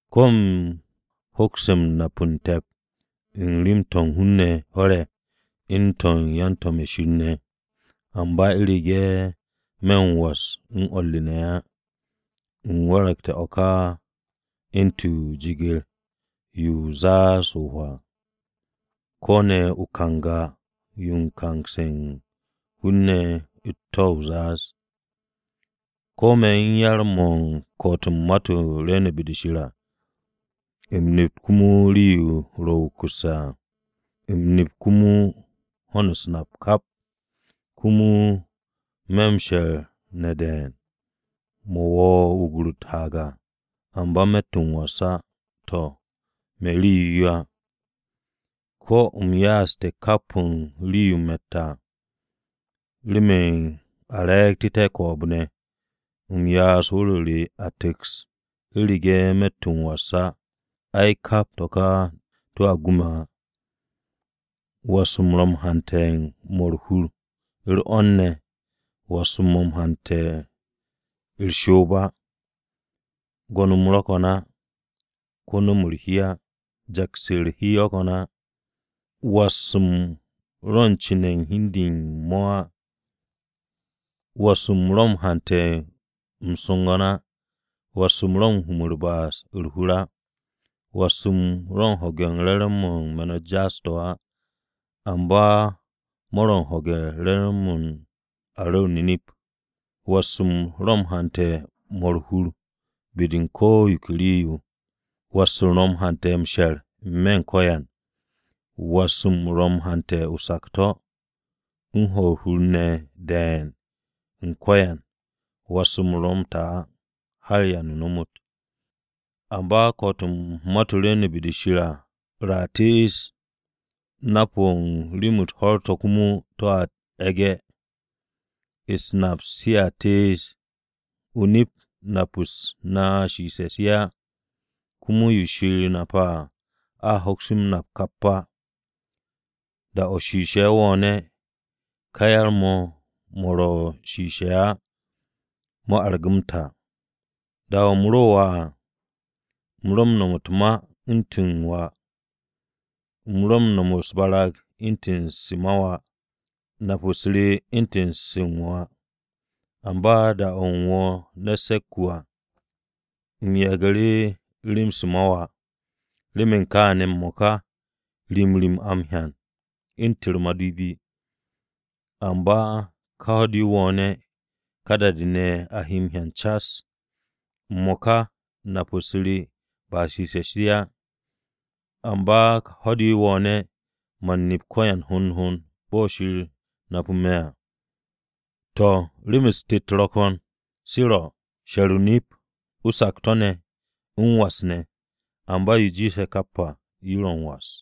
Ko̱ u̱m hoks nap u̱n te̱p u̱n rem-to̱ u̱n hun-ne̱ ho̱r-ye̱ u̱n to̱ u̱n yan-to̱m-ye̱ Shir ne̱, amba u̱rege̱ me̱ m-was u̱n o̱r re ne̱ á, u̱m waragte̱ o̱ ká u̱ntu̱n o-jeger yo u̱n zaaz-o̱ o-hwaa, ko̱ ne̱ o-kanga o̱ u̱n kaas u̱n hun-ne̱ u̱t-to̱ o-zaaz. Ko̱ me̱ u̱n yar-mo̱ u̱n ko̱'o̱t u̱n ma-to̱ rwu̱u̱ne̱ be-de Shir ne̱ à, u̱m nep komo rii-yo ro̱ wukusse̱ à, u̱m nep komo ho̱n u̱s-nap kap. Komo me̱ m-she̱r ne̱ de̱e̱n, mo̱ wo̱o̱ wugur u̱t-haag à, amba me̱tt m-was á, to̱, me̱ rii-yo á. Ko̱ u̱m ya'as kap o̱ u̱n rii-yo u̱m ro̱tte̱ à, remen u̱m re̱e̱gtu̱té̱ ko̱o̱b-ne̱, U̱m ya'as wu̱r-o re a tu̱ks, U̱rege̱ me̱tt m-was á, ai kap to̱ ka to̱a gu me̱ á. Was-mo̱ ro̱ m-hante̱ m-mo̱ u̱r-hur, u̱r-'wo̱n ne̱. Was-m ro̱ m-hante̱ u̱r-shoob á, gwo̱n-m ro̱ ko̱n á, ko̱ nu̱-mo̱ u̱r-hi á. Jaks u̱r-hi ro̱ ko̱n á. Was-m ro̱ u̱n cu̱ne̱ u̱n hi u̱n de u̱n mo̱ á. Was-m ro̱ m-hante̱ o-su̱gu̱m á, Was-m ro̱ m-hum u̱r-ba'as u̱r-hur á. Was-m ro̱ u̱n ho̱ge̱ u̱n re̱re̱m-mo̱ u̱n me̱n-u̱t jaas-to̱ á, amba mo̱ ro̱ u̱n ho̱ge̱-m re̱re̱m-mo̱ u̱n a ru̱r o-nip. Was-m ro̱ u̱n hante̱ u̱n 'mo̱ u̱r-hur be-de u̱n ko̱ yo ke rii-yo. Was-m ro̱ m-hante̱ m-she̱r n-me̱ u̱n ko̱yan, Was-m ro̱ m-hante̱ o-sakto̱ U̱n hwo̱ u̱r-hur ne̱ be-de u̱n ko̱yan. Was-m ro̱ m-ta á har da-o̱ ba m-ta. Amba ko̱'o̱t u̱n ma-to̱ rwu̱u̱ne̱ be-de Shir à a tees, Nap-o̱ u̱n rem-u̱t ho̱r-to̱ komo to̱a e̱ge̱, u̱s-nap sea tees. O-nip nap-u̱s na shiishe̱ se á, Komo yo Shir nape̱ à, a hoks yo m-nap kap á. Da-o̱ shiishe̱ wo̱o̱ne̱, ká yar-mo̱ mo̱ ro̱ Shiishe̱ se á mo̱ argu̱ m-ta. Da-o̱ u̱m ro wà à, U̱m ro u̱n no̱m u̱t-ma u̱ntu̱n to̱ u̱n wà, U̱m ro u̱n no̱m u̱s-barag u̱ntu̱n se u̱n wà, nap-u̱s re u̱ntu̱n se u̱n wà. Amba da-o̱ u̱m wo̱o̱ ne̱t se̱k-wu̱ à u̱m yagu̱ru̱ rem-se ma wà. Remen kaane̱, m-mo̱ka, Rim rim a m-hyan u̱ntu̱n u̱r-madipi, Amba ka ho̱-de wo̱o̱ne̱ ka da-de a he m-hyan cas. M-mo̱ka nap-u̱s re ba shishe̱-se á, amba ká ho̱-de wo̱o̱ne̱ Man nep ko̱yan hond hond bo̱ Shir napu̱ me̱ à. To̱, rem-u̱s tet ro̱ ko̱n se ro̱: She̱r o-nip, O-sakto̱ ne̱, M-was ne̱, amba yo jiishe̱ kap à yo ro̱ m-was.